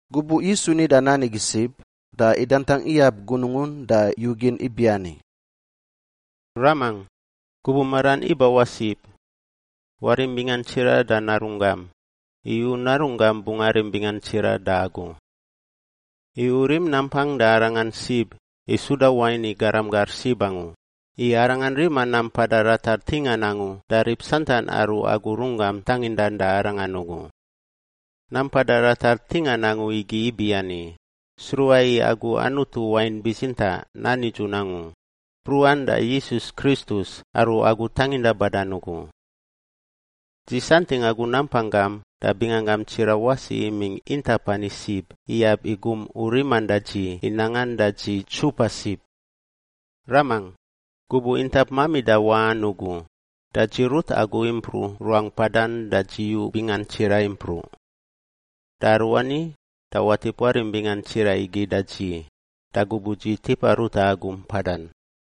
Gubuꞌ Yisu nida nan igi sib, da idantangꞌ iyab gunungun da yugin ibiani, “Ramangꞌ! Gubuꞌ maran ibawaꞌ sib. Warim bingan tsiraꞌ da Narunggam, i U Narunggam bungꞌ arim bingan tsiraꞌ da Agu. I U rim nampang da arangan sib i suda wain i garam gar sib angu, i arangan rima nam mpada ratar ntingan angu da rib santan aru Agu runggam tangindan da arangan ugu. Nam mpada ratar ntingan angu igi ibiani, sruꞌa i Agu, Anutu wain bitsintaꞌ nan nidzun angu, mpruꞌan da Yisus Kristus aru Agu tanginda badan ugu. “Dzi santingꞌ Agu nampang gam da binganggam tsiraꞌ wasi imingꞌ intap ani sib iyab i gum U riman da dzi i nangan da dzi ntsupa sib. Ramangꞌ, gubuꞌ intap mamida waꞌan ugu, da dzi rut Agu impruꞌ ruangꞌ mpadan da dzi yu bingan tsiraꞌ impruꞌ. Da aruani da watip warim bingan tsiraꞌ igi da dzi da gubuꞌ dzi tipa ruta Agu mpadan.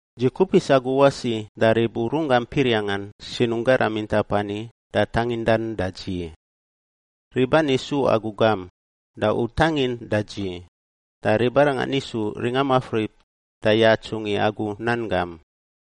“Dzi kupis Agu wasi da rib U runggam piriangꞌan sinungꞌ garam intap ani da tangindan da dzi. Rib ani su Agu gam, da U tangin da dzi, da ribarangan isu ringa mafrip da yatsungꞌ i Agu nan gam.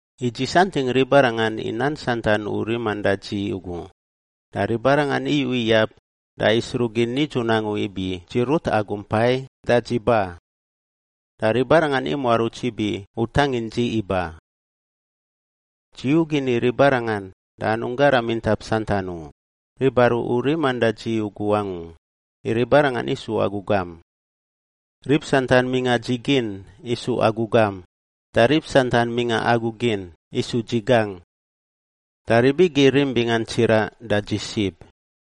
I dzi santingꞌ ribarangan i nan santan U riman da dzi ugu, da ribarangan iyu iyab da isruꞌ gin nidzun angu ibi dzi rut Agu impai da dzi ba. Da ribarangan imuaruts ibi U tangin dzi iba. “Dzi yugin i ribarangan da anungꞌ garam intap santan u, rib aru U riman da dzi ugu angu, i ribarangan isu Agu gam. Rib santan mingꞌa dzi gin isu Agu gam, da rib santan mingꞌa Agu gin isu dzi gangꞌ. Da rib igi irim bingan tsiraꞌ da dzi sib.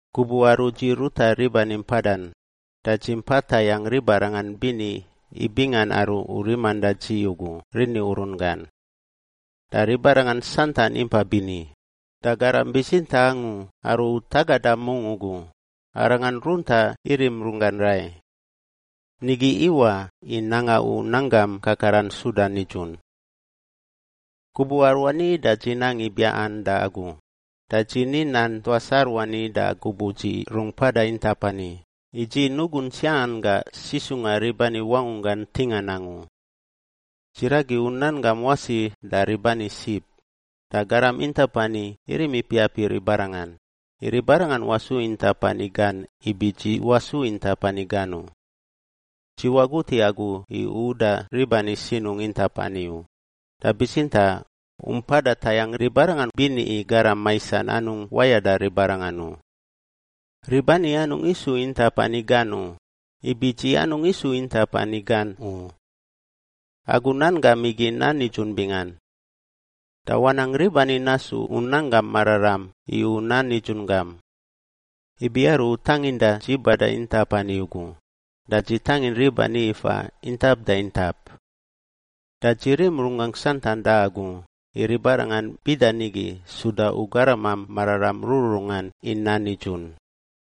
Gubuꞌ aru dzi ruta rib ani mpadan da dzi impa tayangꞌ ribarangan bini i bingan aru U riman da dzi ugu rini urun gan. Da ribarangan santan impa bini, da garam bitsintaꞌ angu aru U tagada mungꞌ ugu, arangan runtaꞌ irim runggan rai. Nigi iwaꞌ i nanga U nan gam kakaran suda nidzun. “Gubuꞌ aruani da dzi nang i biaꞌan da Agu, da dzi ni nan tuas aruani da gubuꞌ dzi rungꞌ mpada intap ani, i dzi nugungꞌ tsiaꞌan gangꞌ sisungꞌa rib ani wangunggan ntingan angu. Dzi ragi U nan gam wasi da rib ani sib, da garam intap ani irim ipiap i ribarangan, i ribarangan wasu intap ani gan ibi dzi wasu intap ani gan u. Dzi wagut i Agu i U uda rib ani sinungꞌ intap ani u, da bitsintaꞌ U mpada tayangꞌ ribarangan bini i Garam Maisan anungꞌ wayada ribarangan u. Rib ani anungꞌ isu intap ani gan u, ibi dzi anungꞌ isu intap ani gan u. Agu nan gam igi nan nidzun bingan. Da wanang rib ani nasu U nanggam mararam i U nan nidzun gam. Ibi aru U tanginda dzi bada intap ani ugu, da dzi tangin rib ani ifa intap da intap. Da dzi rim runggangꞌ santan da Agu i ribarangan bida nigi suda U garamam mararam rururungan i nan nidzun.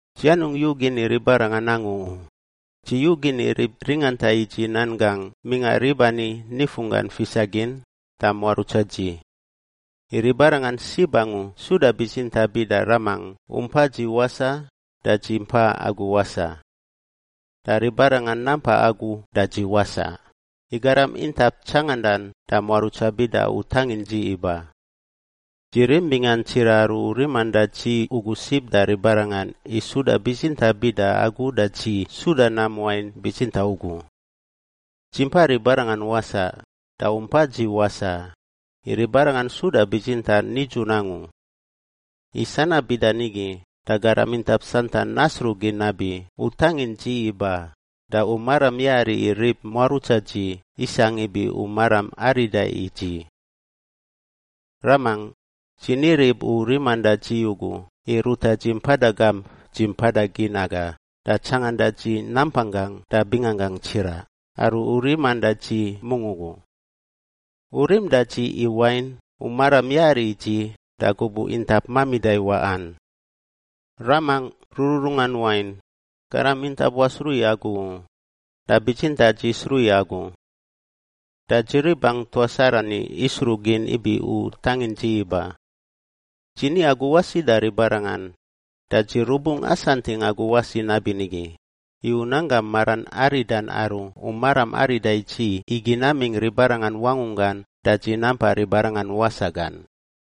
“Dzi anungꞌ yugin i ribarangan angu u, dzi yugin i rib ringanta i dzi nan gangꞌ mingꞌa rib ani nifunggan fisa gin da muarutsa dzi, i ribarangan sib angu suda bitsintaꞌ, bida Ramangꞌ U mpa dzi wasaꞌ da dzi mpa Agu wasaꞌ. Da ribarangan nampa Agu da dzi wasaꞌ, i garam intap tsangandan da muarutsa bida U tangin dzi iba. Dzi rim bingan tsiraꞌ aru U riman da dzi ugu sib da ribarangan i suda bitsintaꞌ bida Agu da dzi suda nam wain bitsintaꞌ ugu. Dzi mpa ribarangan wasaꞌ da U mpa dzi wasaꞌ, i ribarangan suda bitsintaꞌ nidzun angu. I sanab bida nigi da garam intap santan nasruꞌ gin nabi U tangin dzi iba da U maram yari i rib muarutsa dzi isangꞌ ibi U maram arida i dzi. “Ramangꞌ, dzi ni rib U riman da dzi ugu i ruta dzi mpada gamp dzi mpada gin aga da tsanganda dzi nampang gangꞌ da binganggangꞌ tsiraꞌ aru U riman da dzi mungꞌ ugu. U rim da dzi, i wain, U maram yari i dzi da gubuꞌ intap mamida i waꞌan. Ramangꞌ rururungan wain, garam intap wasruꞌ i Agu u, da bitsintaꞌ dzi sruꞌ i Agu. Da dzi ribangꞌ tuas arani isruꞌ gin ibi U tangin dzi iba. Dzi ni Agu wasi da ribarangan, da dzi rubungꞌ asantingꞌ Agu wasi nabinigi, i U nanggam maran aridan aru U maram arida i dzi igi namingꞌ ribarangan wangunggan da dzi nampa ribarangan wasaꞌ gan.”